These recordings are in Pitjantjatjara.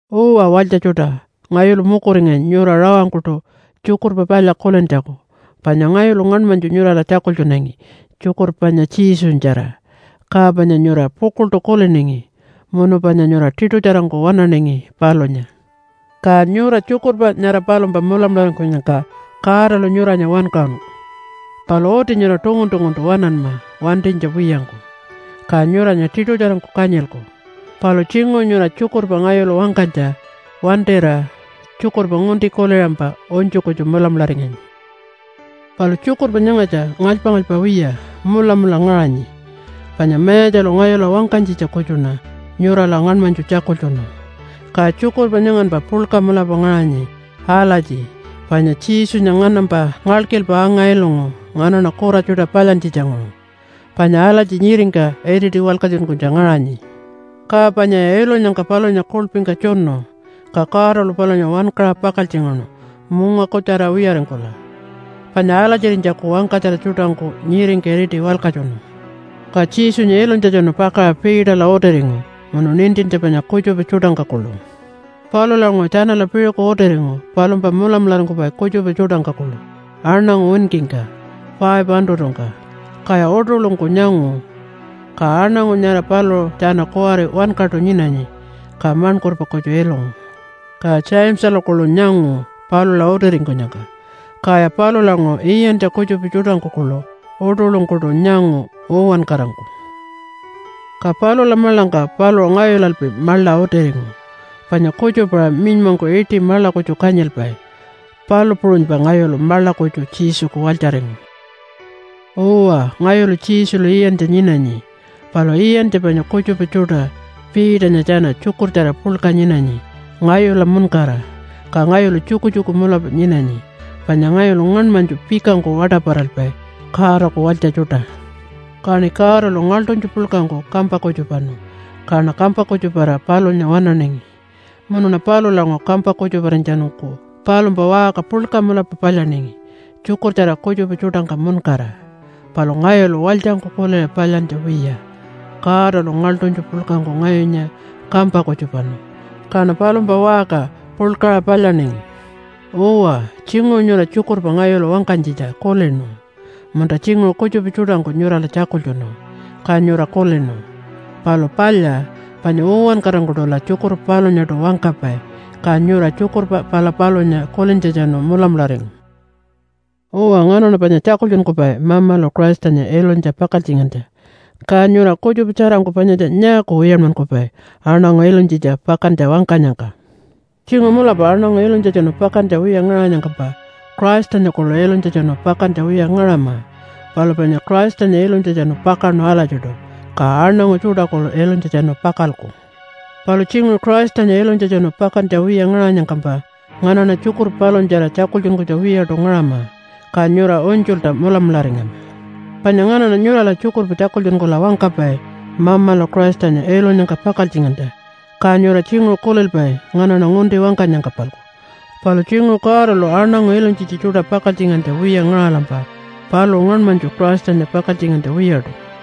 Uwa walytja tjuṯa, ngayulu mukuringanyi nyura rawangkuṯu Tjukurpa Palya kulintjaku panya ngayulu ngaṉmanytju nyurala tjakultjunangi tjukurpa panya Jesunyatjara, ka panya nyura pukuḻṯu kuliningi munu panya nyura tiṯutjarangku waṉaningi palunya. Ka nyura tjukurpa nyara palumpa mulamularingkunyangka Godalu nyuranya wankaṟunu. Palu uti nyura tungun-tunguntu waṉanma wantinytja wiyangku, ka nyuranya tiṯutjarangku kanyilku. Palu tjinguṟu nyura tjukurpa ngayulu wangkanytja wantira tjukurpa ngunti kuliṟampa unytju kutju mulamularingangi. Palu tjukurpa nyangatja ngalypa-ngalypa wiya mulamula ngaṟanyi, panya Mayatjalu ngayula wangkanytjitja kutjuṉa nyurala ngaṉmanytju tjakultjunu. Ka tjukurpa nyanganpa puḻka mulapa ngaṟanyi alatji, Panya Jesunya nganampa ngalkilpa anga-ilungu nganaṉa kura tjuṯa palyantjitjanguṟu, panya alatji nyiringka iriti walkatjunkunytja ngaṟanyi. Ka panyaya ilunyangka palunya kuḻpingka tjunu, ka Godalu palunya wankaṟa pakaltjingaṉu munga kutjara wiyaringkula, panya alatjirinytjaku wangkatjara tjuṯangku nyiringka iriti walkatjunu. Ka Jesunya ilunytjatjanu pakaṟa Peterla utiringu munu nintintja panya kutjupa tjuṯangka kuḻu. Palulanguṟu tjanala piṟuku utiringu palumpa mulamularingkupai kutjupa tjuṯangka kuḻu aṉangu winkingka 500-ngka, kaya uṯuḻungku nyangu. Ka aṉangu nyara paluṟu tjana kuwari wankaṯu nyinanyi, ka maṉkurpa kutju ilungu. Ka Jamesalu kuḻu nyangu palula utiringkunyangka. Kaya palulanguṟu iyantja kutjupa tjuṯangku kuḻu uṯuḻungkuṯu nyangu uwankarangku. Ka palula maḻangka paluṟu ngayulalpi maḻa utiringu. Panya kutjupa-aṟa minymangku iṯi maḻa kutju kanyilpai, palu puṟunypa ngayulu maḻa kutju Jesuku walytjaringu. Uwa, ngayulu Jesulu iyantja nyinanyi, palu iyantja panya kutjupa tjuṯa Peternya tjana tjukurtjara puḻka nyinanyi ngayula muṉkara. Ka ngayulu tjukutjuku mulapa nyinanyi, panya ngayulu ngaṉmanytju pikangku waṯaparalpai Godaku walytja tjuṯa. Kaṉi Godalu ngaḻṯunytju puḻkangku kampa kutjupanu kaṉa kampa kutjuparira palunya waṉaningi. Munuṉa palulanguṟu kampa kutjuparinytjatjanungku palumpa waṟka puḻka mulapa palyaningi tjukurtjara kutjupa tjuṯangka muṉkara. Palu ngayulu walytjangku kuliṟa palyantja wiya. Godalu ngaḻṯunytju puḻkangku ngayunya kampa kutjupanu, kaṉa palumpa waṟka puḻkaṟa palyaningi. Uwa, tjinguṟu nyura tjukurpa ngayulu wangkanytjitja kulinu, munta tjinguṟu kutjupa tjuṯangku nyurala tjakultjunu, ka nyura kulinu. Palu palya, panya uwankarangkuṯula tjukurpa palunyaṯu wangkapai. Ka nyura tjukurpa pala palunya kulintjatjanu mulamularingu. Uwa, nganaṉa panya tjakultjunkupai Mamalu Christanya ilunytja pakaltjingantja. Ka nyura kutjupa tjarangku panyatja nyaaku wiyanmankupai aṉangu ilunytjitja pakantja wangkanyangka? Tjinguṟu mulapa aṉangu ilunytjatjanu pakantja wiya ngaṟanyangkampa, Christanya kuḻu ilunytjatjanu pakantja wiya ngaṟama. Palu panya Christanya ilunytjatjanu pakaṉu alatjiṯu, ka aṉangu tjuṯa kuḻu ilunytjatjanu pakalku. Palu tjinguṟu Christanya ilunytjatjanu pakantja wiya ngaṟanyangkampa nganaṉa tjukurpa palunyatjara tjakultjunkunytjaku wiyaṯu ngaṟama, ka nyura unytjulta mulamularingama. Panya nganaṉa nyurala tjukurpa tjakultjunkula wangkapai Mamalu Christanya ilunyangka pakaltjingantja, ka nyura tjinguṟu kulilpai nganaṉa ngunti wangkanyangka-palku. Palu tjinguṟu Godalu aṉangu ilunytjitja tjuṯa pakaltjingantja wiya ngaṟalampa paluṟu ngaṉmanytju Christanya pakaltjingantja wiyaṯu.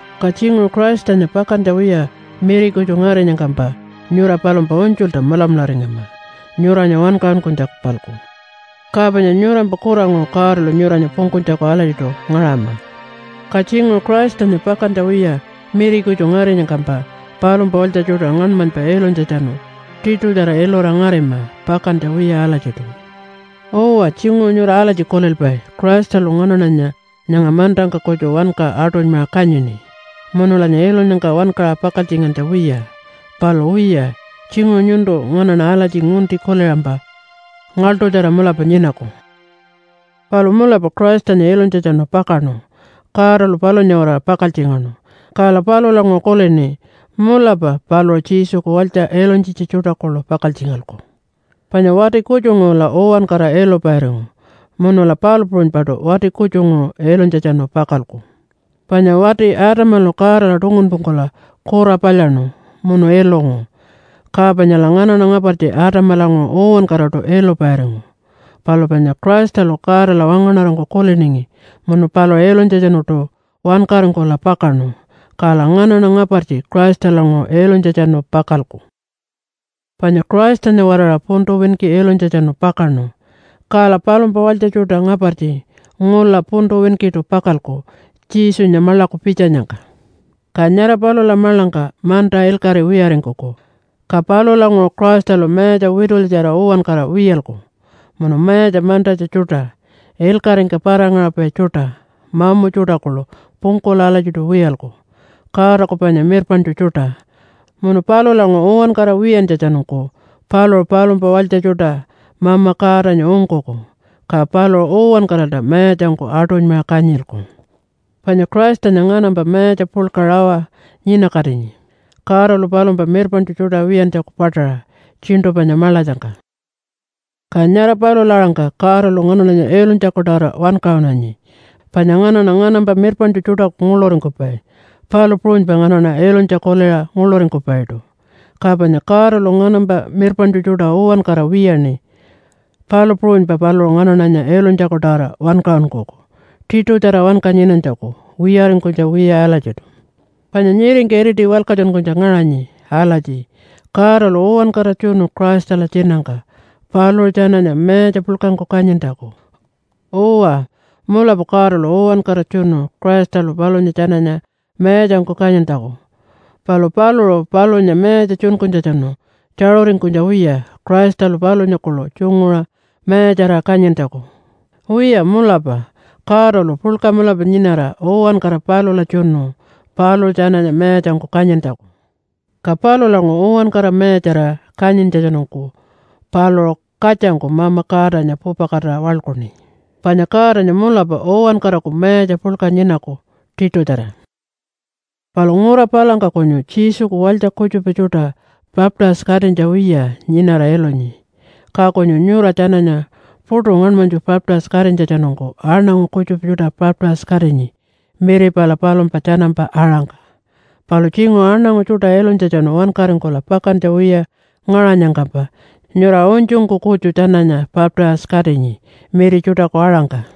Ka tjinguṟu Christanya pakantja wiya miri kutju ngarinyangkampa nyura palumpa unytjulta mulamularingama nyuranya wankaṟunkunytjaku-palku, ka panya nyurampa kuranguṟu Godalu nyuranya pungkunytjaku alatjiṯu ngaṟama. Ka tjinguṟu Christanya pakantja wiya miri kutju ngarinyangkampa palumpa walytja tjuṯa ngaṉmanypa ilunytjatjanu tiṯutjara ilura ngarima pakantja wiya alatjiṯu. Uwa, tjinguṟu nyura alatji kulilpai, “Christalu nganaṉanya nyanga mantangka kutju wanka aṯunymaṟa kanyini, munulanya ilunyangka wankaṟa pakaltjingantja wiya.” Palu wiya, tjinguṟu nyuntu nganaṉa alatji ngunti kuliṟampa ngaḻṯutjara mulapa nyinaku. Palu mulapa Christanya ilunytjatjanu pakaṉu. Godalu palunya-waraṟa pakaltjingaṉu, kala palulanguṟu kulini mulapa paluṟu Jesuku walytja ilunytjitja tjuṯa kuḻu pakaltjingalku. Panya wati kutjunguṟula uwankara ilupairingu, munula palu puṟunypaṯu wati kutjunguṟu ilunytjatjanu pakalku. Panya wati Adamalu Godala tungunpungkula kura palyaṉu munu ilungu, ka panyala nganaṉa ngapartji Adamalanguṟu uwankaraṯu ilupairingu. Palu panya Christalu Godala wangaṉarangku kuliningi munu paluṟu ilunytjatjanuṯu wankaringkula pakaṉu, kala nganaṉa ngapartji Christalanguṟu ilunytjatjanu pakalku. Panya Christanya-waraṟa puntu winki ilunytjatjanu pakaṉu, kala palumpa walytja tjuṯa ngapartji ngula puntu winkiṯu pakalku Jesunya maḻaku pitjanyangka. Ka nyara palula maḻangka manta ilkaṟi wiyaringkuku, ka palulanguṟu Christalu mayatja witulyatjara uwankara wiyalku, munu mayatja mantatja tjuṯa, ilkaṟingka para-ngaṟapai tjuṯa, mamu tjuṯa kuḻu pungkula alatjiṯu wiyalku, Godaku panya mirpaṉtju tjuṯa. Munu palulanguṟu uwankara wiyantjatjanungku paluṟu palumpa walytja tjuṯa Mama Godanya ungkuku, ka paluṟu uwankaralta mayatjangku aṯunymaṟa kanyilku. Panya Christanya nganampa mayatja puḻka rawa nyinakatinyi Godalu palumpa mirpaṉtju tjuṯa wiyantjaku paṯaṟa tjiṉṯu panya maḻatjangka. Ka nyara palula-aṟangka Godalu nganaṉanya ilunytjaku-tawara wankaṟunanyi. Panya nganaṉa nganampa mirpaṉtju tjuṯaku nguḻuringkupai, palu puṟunypa nganaṉa ilunytja kuliṟa nguḻuringkupaiṯu. Ka panya Godalu nganampa mirpaṉtju tjuṯa uwankara wiyaṉi, palu puṟunypa paluṟu nganaṉanya ilunytjaku-tawara wankaṟunkuku tiṯutjara wanka nyinanytjaku wiyaringkunytja wiya alatjiṯu. Panya nyiringka iriti walkatjunkunytja ngaṟanyi alatji, “Godalu uwankara tjunu Christala tjinangka paluṟu tjananya mayatja puḻkangku kanyintjaku.” Uwa, mulapa Godalu uwankara tjunu Christalu palunya tjananya mayatjangku kanyintjaku, palu paluṟu palunya mayatja tjunkunytjatjanu tjaṟuringkunytja wiya Christalu palunya kuḻu tjunguṟa mayatjarira kanyintjaku. Wiya, mulapa Godalu puḻka mulapa nyinara uwankara palula tjunu paluṟu tjananya mayatjangku kanyintjaku. Ka palulanguṟu uwankara mayatjarira kanyintjatjanungku paluṟu katjangku Mama Godanya pupakatira waḻkuṉi. Panya Godanya mulapa uwankaraku mayatja puḻka nyinaku tiṯutjara. Palu ngura palangka kunyu Jesuku walytja kutjupa tjuṯa baptise-katinytja wiya nyinara ilunyi, ka kunyu nyura tjananya puṯu ngaṉmanytju baptise-katinytjatjanungku aṉangu kutjupa tjuṯa baptise-katinyi miri pala palumpa tjanampa aṟangka. Palu tjinguṟu aṉangu tjuṯa ilunytjatjanu wankaringkula pakantja wiya ngaṟanyangkampa nyura unytjungku kutju tjananya baptise-katinyi miri tjuṯaku aṟangka.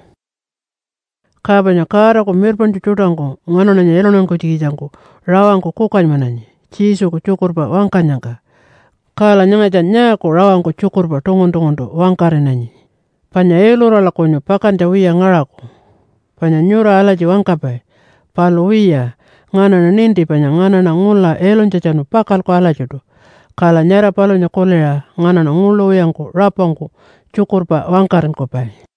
Ka panya Godaku mirpaṉtju tjuṯangku nganaṉanya iluntankunytjikitjangku rawangku kukanymananyi Jesuku tjukurpa wangkanyangka. Kala nyangatja nyaaku rawangku tjukurpa tungun-tunguntu wangkaṟinanyi? Panya ilurala kunyu pakantja wiya ngaṟaku, panya nyura alatji wangkapai. Palu wiya, nganaṉa ninti panya nganaṉa ngula ilunytjatjanu pakalku alatjiṯu, kala nyara palunya kuliṟa nganaṉa nguḻu wiyangku rapangku tjukurpa wangkaṟinkupai.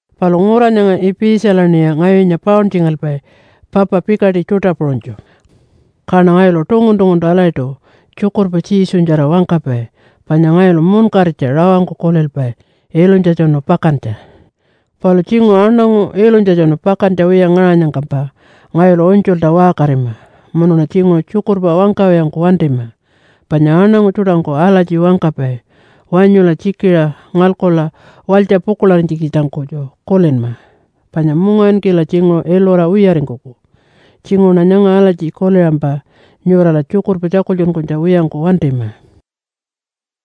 Palu ngura nyanga Ipitjalaṉiya ngayunya pauntjingalpai papa pikaṯi tjuṯa puṟunytju. Kaṉa ngayulu tungun-tunguntu alatjiṯu tjukurpa Jesunyatjara wangkapai panya ngayulu munkaritja rawangku kulilpai ilunytjatjanu pakantja. Palu tjinguṟu aṉangu ilunytjatjanu pakantja wiya ngaṟanyangkampa ngayulu unytjulta waṟkarima, munuṉa tjinguṟu tjukurpa wangkawiyangku wantima. Panya aṉangu tjuṯangku alatji wangkapai, “Wanyula tjikiṟa ngalkula walytja pukuḻarinytjikitjangku kutju kulinma, panya mungawinkila tjinguṟu ilura wiyaringkuku.” Tjinguṟuṉa nyanga alatji kuliṟampa nyurala tjukurpa tjakultjunkunytja wiyangku wantima.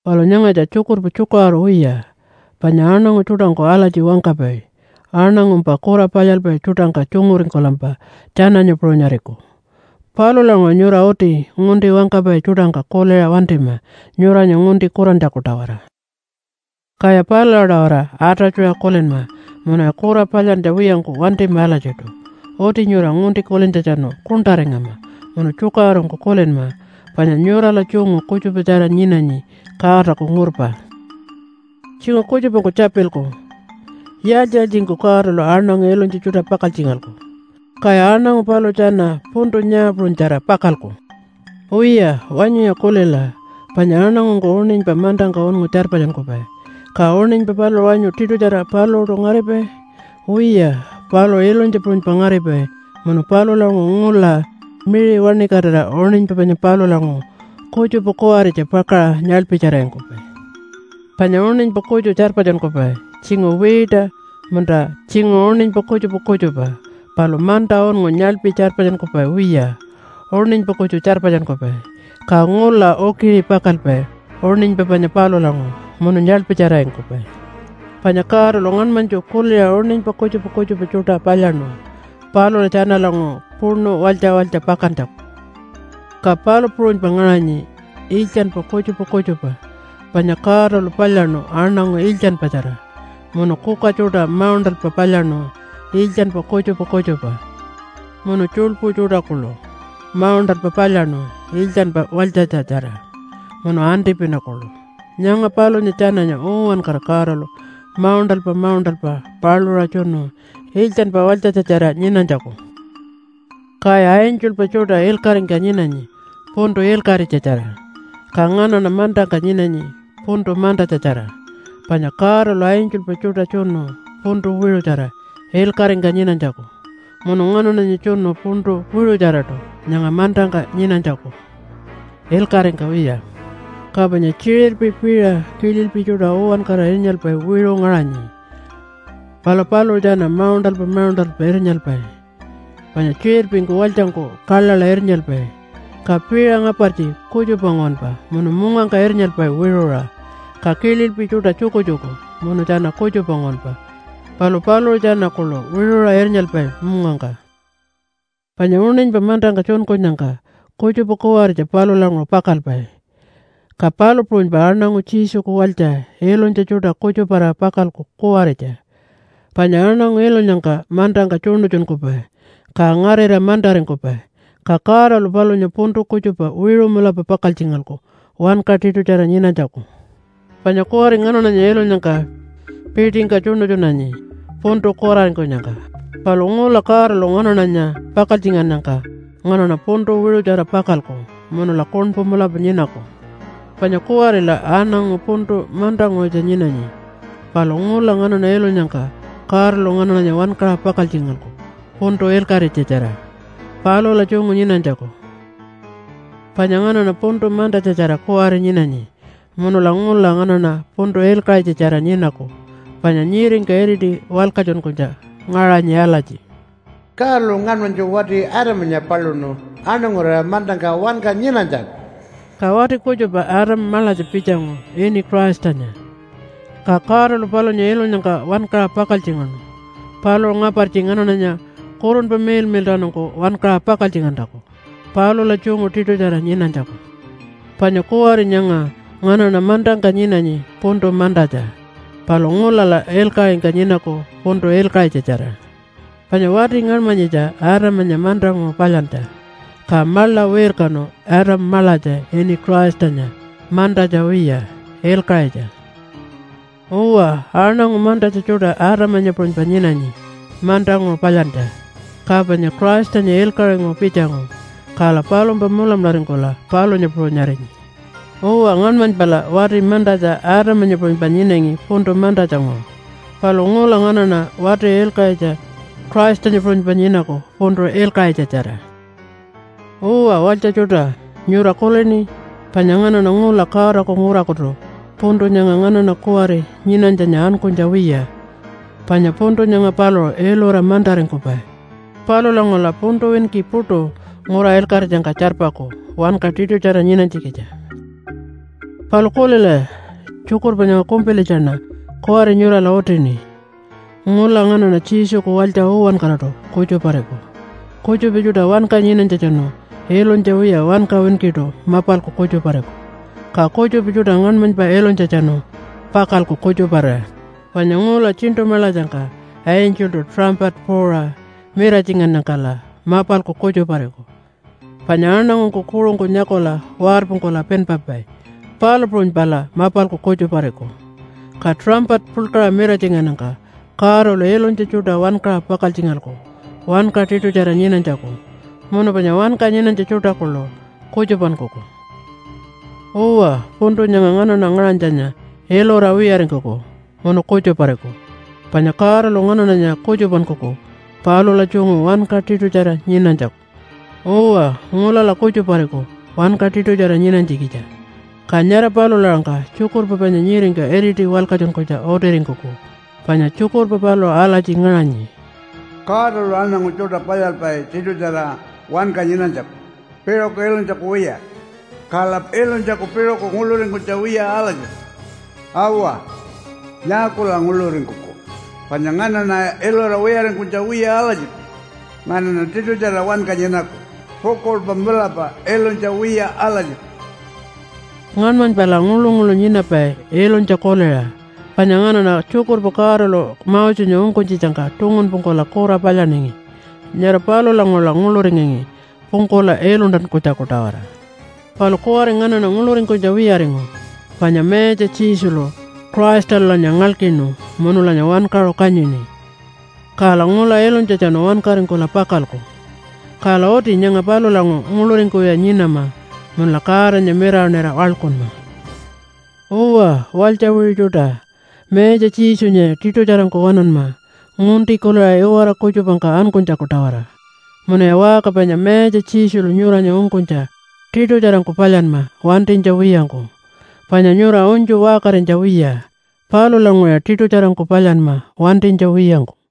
Palu nyangatja tjukurpa tjukaṟuru wiya. Panya aṉangu tjuṯangku alatji wangkapai, “Aṉangumpa kura palyalpai tjuṯangka tjunguringkulampa tjananya puṟunyariku.” Palulanguṟu nyura uti ngunti wangkapai tjuṯangka kuliṟa wantima nyuranya ngunti kurantjaku-tawara. Kaya palula-tawara atatjuṟa kulinma munuya kura palyantja wiyangku wantima alatjiṯu. Uti nyura ngunti kulintjatjanu kuṉṯaringama munu tjukaṟurungku kulinma, panya nyurala tjungu kutjupatjara nyinanyi Godaku ngurpa. Tjinguṟu kutjupangku tjapilku, “Yaaltji-yaaltjingku Godalu aṉangu ilunytja tjuṯa pakaltjingalku? Kaya aṉangu paluṟu tjana puntu nyaa puṟunytjara pakalku?” Wiya wanyuya kulila, panya aṉangungku uṉinypa mantangka unngu tjarpatjunkupai, ka uṉinypa paluṟu wanyu tiṯutjara paluṟuṯu ngaripai? Wiya, paluṟu ilunytja puṟunypa ngaripai munu palulanguṟu ngula miṟi wantikatira uṉinypa panya palulanguṟu kutjupa kuwaritja pakaṟa nyaḻpitjararingkupai. Panya uṉinypa kutju tjarpatjunkupai tjinguṟu wiita munta tjinguṟu uṉinypa kutjupa kutjupa, palu manta unngu nyaḻpi tjarpatjunkupai wiya, uṉinypa kutju tjarpatjunkupai, ka ngula ukiṟi pakalpai uṉinypa panya palulanguṟu munu nyaḻpitjararingkupai. Panya Godalu ngaṉmanytju kuliṟa uṉinypa kutjupa kutjupa tjuṯa palyaṉu palula tjanalanguṟu puṉu walytja walytja pakantjaku. Ka palu puṟunypa ngaṟanyi iltjanpa kutjupa kutjupa. Panya Godalu palyaṉu aṉangu iltjanpatjara, munu kuka tjuṯa mauṉṯalpa palyaṉu iltjanpa kutjupa kutjupa, munu tjuḻpu tjuṯa kuḻu mauṉṯalpa palyaṉu iltjanpa walytjatja-tjara, munu antipina kuḻu. Nyanga palunya tjananya uwankara Godalu mauṉṯalpa mauṉṯalpa paluṟa tjunu iltjanpa walytjatja-tjara nyinanytjaku. Kaya angelpa tjuṯa ilkaṟingka nyinanyi puntu ilkaṟitjatjara, ka nganaṉa mantangka nyinanyi puntu mantatja-tjara. Panya Godalu angelpa tjuṯa tjunu puntu wiṟutjara ilkaṟingka nyinanytjaku, munu nganaṉanya tjunu puntu wiṟutjaraṯu nyanga mantangka nyinanytjaku ilkaṟingka wiya. Ka panya tjiṟirpi, piṟa, kililpi tjuṯa uwankara irnyalpai wiṟu ngaṟanyi, palu paluṟu tjana mauṉṯalpa mauṉṯalpa irnyalpai. Panya tjiṟirpingku walytjangku kaḻaḻa irnyalpai, ka piṟa ngapartji kutjupa nguwanpa munu mungangka irnyalpai wiṟuṟa. Ka kililpi tjuṯa tjukutjuku munu tjana kutjupa nguwanpa, palu paluṟu tjana kuḻu wiṟuṟa irnyalpai mungangka. Panya uṉinypa mantangka tjunkunyangka kutjupa kuwaritja palulanguṟu pakalpai, ka palu puṟunypa aṉangu Jesuku walytja ilunytja tjuṯa kutjuparira pakalku kuwaritja. Panya aṉangu ilunyangka mantangka tjuṉutjunkupai, ka ngarira mantaringkupai. Ka Godalu palunya puntu kutjupa wiṟu mulapa pakaltjingalku wanka tiṯutjara nyinanytjaku. Panya kuwari nganaṉanya ilunyangka piṯingka tjuṉutjunanyi puntu kuraringkunyangka, palu ngula Godalu nganaṉanya pakaltjingannyangka nganaṉa puntu wiṟutjara pakalku munula kuṉpu mulapa nyinaku. Panya kuwarila aṉangu puntu mantanguṟutja nyinanyi, palu ngula nganaṉa ilunyangka Godalu nganaṉanya wankaṟa pakaltjingalku puntu ilkaṟitjatjara palula tjungu nyinanytjaku. Panya nganaṉa puntu mantatja-tjara kuwari nyinanyi, munula ngula nganaṉa puntu ilkaṟitjatjara nyinaku. Panya nyiringka iriti walkatjunkunytja ngaṟanyi alatji, “Godalu ngaṉmanytju wati Adamanya paluṉu aṉangurira mantangka wanka nyinanytjaku.” Ka wati kutjupa Adam maḻatja pitjangu ini Christanya. Ka Godalu palunya ilunyangka wankaṟa pakaltjingaṉu paluṟu ngapartji nganaṉanya Kurunpa Miḻmiḻṯawanungku wankaṟa pakaltjingantjaku palula tjungu tiṯutjara nyinanytjaku. Panya kuwari nyanga nganaṉa mantangka nyinanyi puntu mantatja, palu ngulala ilkaṟingka nyinaku puntu ilkaṟitjatjara. Panya wati ngaṉmanyitja Adamanya mantanguṟu palyantja. Ka maḻa wirkanu Adam maḻatja ini Christanya mantatja wiya, ilkaṟitja. Uwa, aṉangu mantatja tjuṯa Adamanya puṟunypa nyinanyi, mantanguṟu palyantja. Ka panya Christanya ilkaṟinguṟu pitjangu, kala palumpa mulamularingkula palunya puṟunyarinyi. Uwa, ngaṉmanypala wati mantatja Adamanya puṟunypa nyinangi puntu mantatjanguṟu. Palu ngula nganaṉa wati ilkaṟitja Christanya puṟunypa nyinaku puntu ilkaṟitjatjara. Uwa walytja tjuṯa, nyura kulini? Panya nganaṉa ngula Godaku ngurakutu puntu nyanga nganaṉa kuwari nyinanytjanya ankunytja wiya. Panya puntu nyanga paluṟu ilura mantaringkupai. Palulanguṟula puntu winki puṯu ngura ilkaṟitjangka tjarpaku wanka tiṯutjara nyinanytjikitja. Palu kulilaya, tjukurpa nyanga kumpilitjaṉa kuwari nyurala utini. Ngula nganaṉa Jesuku walytja uwankaraṯu kutjupariku. Kutjupa tjuṯa wanka nyinanytjatjanu ilunytja wiya wanka winkiṯu mapalku kutjupariku. Ka kutjupa tjuṯa ngaṉmanypa ilunytjatjanu pakalku kutjuparira. Panya ngula tjiṉṯu maḻatjangka angeltu tuṟampata puuṟa miratjingannyangkala mapalku kutjupariku, panya aṉangungku kuṟungku nyakula warpungkula pinpapai, palu puṟunypala mapalku kutjupariku. Ka tuṟampata puḻkaṟa miratjingannyangka Godalu ilunytja tjuṯa wankaṟa pakaltjingalku wanka tiṯutjara nyinanytjaku, munu panya wanka nyinanytja tjuṯa kuḻu kutjupankuku. Uwa, puntu nyanga nganaṉa ngaṟanytjanya ilura wiyaringkuku munu kutjupariku. Panya Godalu nganaṉanya kutjupankuku palula tjungu wanka tiṯutjara nyinanytjaku. Uwa, ngulala kutjupariku wanka tiṯutjara nyinanytjikitja. Ka nyara palula-aṟangka tjukurpa panya nyiringka iriti walkatjunkunytja utiringkuku. Panya tjukurpa paluṟu alatji ngaṟanyi, “Godalu aṉangu tjuṯa palyalpai tiṯutjara wanka nyinanytjaku piṟuku ilunytjaku wiya. Kala ilunytjaku piṟuku nguḻuringkunytja wiya alatjiṯu.” “Awa. Nyaakula nguḻuringkuku, panya nganaṉa ilura wiyaringkunytja wiya alatjiṯu. Nganaṉa tiṯutjara wanka nyinaku pukuḻpa mulapa ilunytja wiya alatjiṯu.” Ngaṉmanypala nguḻu-nguḻu nyinapai ilunytja kuliṟa. Panya nganaṉa tjukurpa Godalu Mosenya ungkunytjitjangka tungunpungkula kura palyaningi. Nyara palulanguṟula nguḻuringangi pungkula iluntankunytjaku-tawara. Palu kuwari nganaṉa nguḻuringkunytja wiyaringu panya Mayatja Jesulu Christalulanya ngalkinu munulanya wankaṟu kanyini, kala ngula ilunytjatjanu wankaringkula pakalku. Kala uti nyanga palulanguṟu nguḻuringkuwiya nyinama munula Godanya mirawaṉira waḻkunma. Uwa, walytja wiṟu tjuṯa, Mayatja Jesunyaya tiṯutjarangku waṉanma ngunti kuliṟa iwara kutjupangka ankunytjaku-tawara. Munuya waṟka panya Mayatja Jesulu nyuranya ungkunytja tiṯutjarangku palyanma wantinytja wiyangku, panya nyura unytju waṟkarinytja wiya. Palulanguṟuya tiṯutjarangku palyanma wantinytja wiyangku.